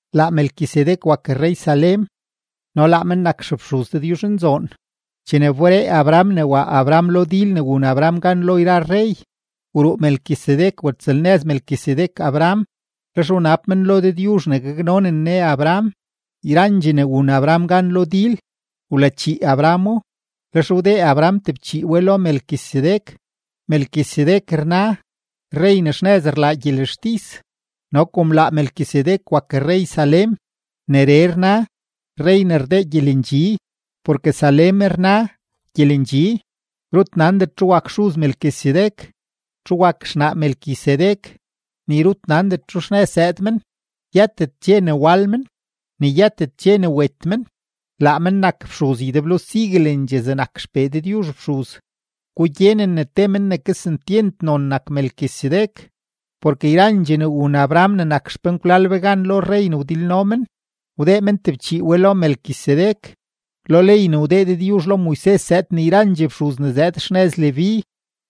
Laa Melquisedec wak rrey Salem no laa men nak xefxuz Dëdyuzhnzoon. Chene wberee Abraham ne wa Abraham lo dil ne wun Abraham gan lo yra rrey, wruu Melquisedec watsëlnëz Melquisedec Abraham, lex wnab men lo Dëdyuzh ne gaknonen Ne Abraham. Yrandxee ne wun Abraham gan lo dil, wlachii Abrahamo, lex wdee men tebchii we lo Melquisedec. Melquisedec rna “rrey ne xnëz rlaa gyelextis”; no kom laa Melquisedec wak rrey Salem, neree rna “rrey ne rdee gyelendxi” porke Salem rna “gyelendxi”. Rut nandet txu wak xuz Melquisedec, txu wak xnaa Melquisedec, ni rut nandet txu xnëz zëëd men, yëtet dxe ne wal men, ni yëtet dxe ne wet men. Laa men nak fxuz ydeblo siguelendxee zegnak XPee Dëdyuzh fxuz. Gugyenen ne te men ne kesentyent non nak Melquisedec, porke yrandxee ne wun Abraham ne nak xpenkwlal be gan lo rrey ne wdilno men, wdee men tebchii we lo Melquisedec. Lo ley ne wdee Dëdyuzh lo Moises zëëd ne yrandxee fxuz ne zëëd xnëz Leví,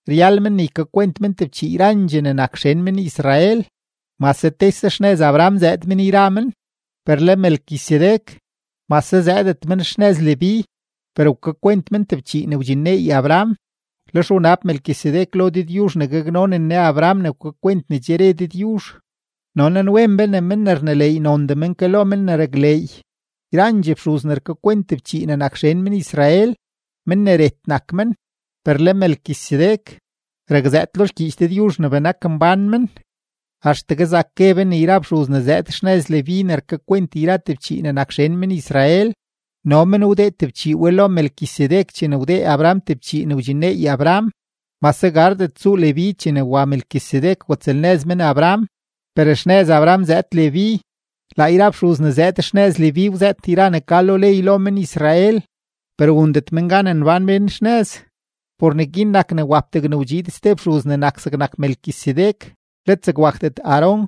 ryal men ne ykakwent men tebchii yrandxee ne nak xen men-Israel, mase tese xnëz Abraham zëëd men yra men. Per le Melquisedec, mase zëëdet men xnëz Leví, per wkakwent men tebchii ne wdxinneey Abraham. Lex wnab Melquisedec lo Dëdyuzh ne gaknonen Ne Abraham ne wkakwent ne che re Dëdyuzh. No nanwen be ne men ne rneleey nondee men ke lo men ne rakleey. Yrandxee fxuz ne rkakwent tebchii ne nak xen men-Israel, mén ne ret nak men. Per le Melquisedec, rakzëët lo xgyiich Dëdyuzh ne benak mbán men. Axtegue zak gue be ne yra fxuz ne zëëd xnëz Leví ne rkakwent yra tebchii ne nak xen men-Israel, no men wdee tebchii we lo Melquisedec chene wdee Abraham tebchii ne wdxinneey Abraham, mase gardet tsuu Leví chene wa Melquisedec watsëlnëz men Abraham, per xnëz Abraham zëëd Leví. Laa yra fxuz ne zëëd xnëz Leví wzëët yra ne ka lo ley lo men-Israel, per wundet men gan nbán mén xnëz. Por neguin nak ne wap degne wdxiid ste fxuz ne nak zegnak Melquisedec let zeg wakdet Aarón.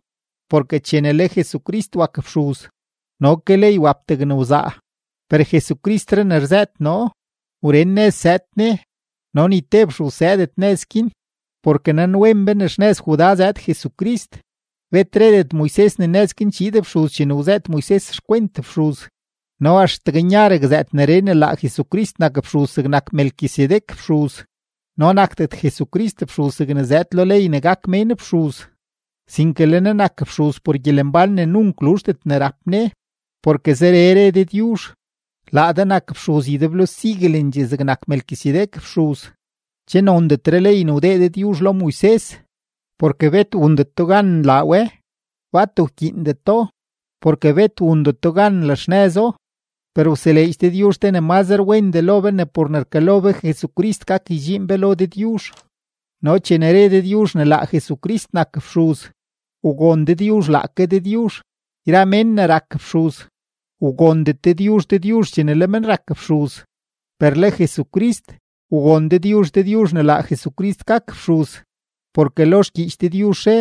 Porke chene le Jesucrist wak fxuz, no ke ley wap degne wzaa. Per Jesucristree ne rzëët noo, wren nëz zëëd Ne, no ni te fxuz zëëdet nëz guin. Porke nanwen be ne xnëz Judá zëëd Jesucrist, bet redet Moises ne nëz guin chiid fxuz chene wzëët Moises xkwent fxuz. No axtegue nya rakzëët neree ne laa Jesucrist nak fxuz zegnak Melquisedec fxuz. No nakdet Jesucrist fxuz zegne zëëd lo ley ne gak mén fxuz, sinke le Ne nak fxuz por gyelembán ne nunk luzhdet ne rap Ne. Porke zeree re Dëdyuzh: Laa de nak fxuz ydeblo siguelendxee zegnak Melquisedec fxuz. Che nondetre ley ne wdee Dëdyuzh lo Moises, porke bet wundeto gan nlaa we, bat wkyiindeto, porke bet wundeto gan nlaxnëzo, per wseleedx Dëdyuzh te ne mazre wendee lo be ne por ne rkalo be Jesucrist gak ydxiin be lo Dëdyuzh. No chene re Dëdyuzh ne laa Jesucrist nak fxuz, wgon Dëdyuzh laake Dëdyuzh. Yra mén ne rak fxuz, wgondet Dëdyuzh Dëdyuzh chene le men rak fxuz. Per le Jesucrist, wgon Dëdyuzh Dëdyuzh ne laa Jesucrist gak fxuz, porke lo xgyiich Dëdyuzh re: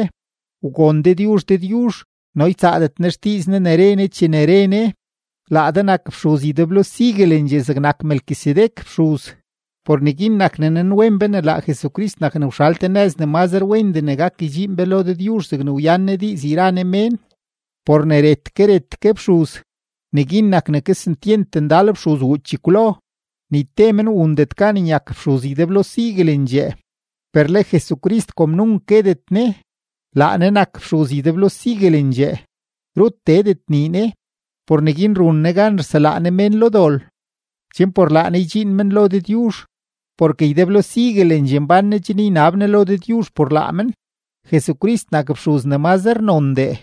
Wgon Dëdyuzh Dëdyuzh no ytsaadet Ne xdiiz Ne ne re Ne chene re Ne: “Laa de nak fxuz ydeblo siguelendxee zegnak Melquisedec fxuz.” Por neguin nak ne nanwen be ne laa Jesucrist nak ne wxal te nëz ne mazre wendee ne gak ydxiin be lo Dëdyuzh zegne wyan Ne diiz yra Ne mén. Por ne ret ke ret ke fxuz, neguin nak ne kesentyent ndal fxuz wuu chekwlo, ni te men wundet gan ne nyak fxuz ydeblo siguelendxee. Per le Jesucrist, kom nunk guetet Ne, laa Ne nak fxuz ydeblo siguelendxee, rut teedet nii Ne. Por neguin run Ne gan rselaa Ne mén lo dol, chen por laa Ne ydxiin men lo Dëdyuzh, porke ydeblo siguelendxee mbán Ne chen ynab Ne lo Dëdyuzh por laa men. Jesucrist nak fxuz ne mazre nondee,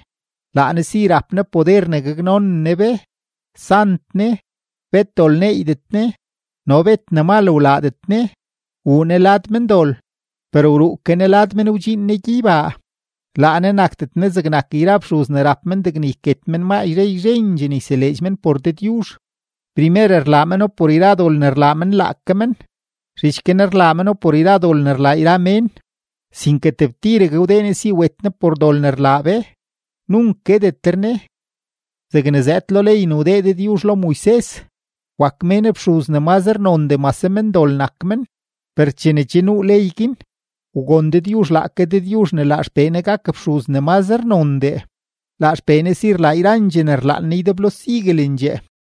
laa Ne si rap Ne poder ne gaknonen Ne be. Sant Ne, bet dol neeydet Ne no bet ne mal wlaadet Ne, wuu Ne lad mendol, per wruu ke Ne lad men wdxiin Ne gyeybaa. Laa Ne nakdet Ne zegnak yra fxuz ne rap men degne yket men maa yzhe yzhendxee ne yseleedx men por Dëdyuzh. Primer rlaa meno por yra dol ne rlaa men laake men, zhich guin rlaa meno por yra dol ne rlaa yra mén. Sinke tebtiregue wdee Ne si wet Ne por dol ne rlaa be, nunk guetetre Ne. Zegne zëëd lo ley ne wdee Dëdyuzh lo Moises, wak mén fxuz ne mazre nondee mase mendol nak men, per chene che nuu ley guin, wgon Dëdyuzh laake Dëdyuzh ne laa XPee Ne gak fxuz ne mazre nondee, laa XPee Ne si rlaa yrandxee ne rlaan Ne ydeblo siguelendxee.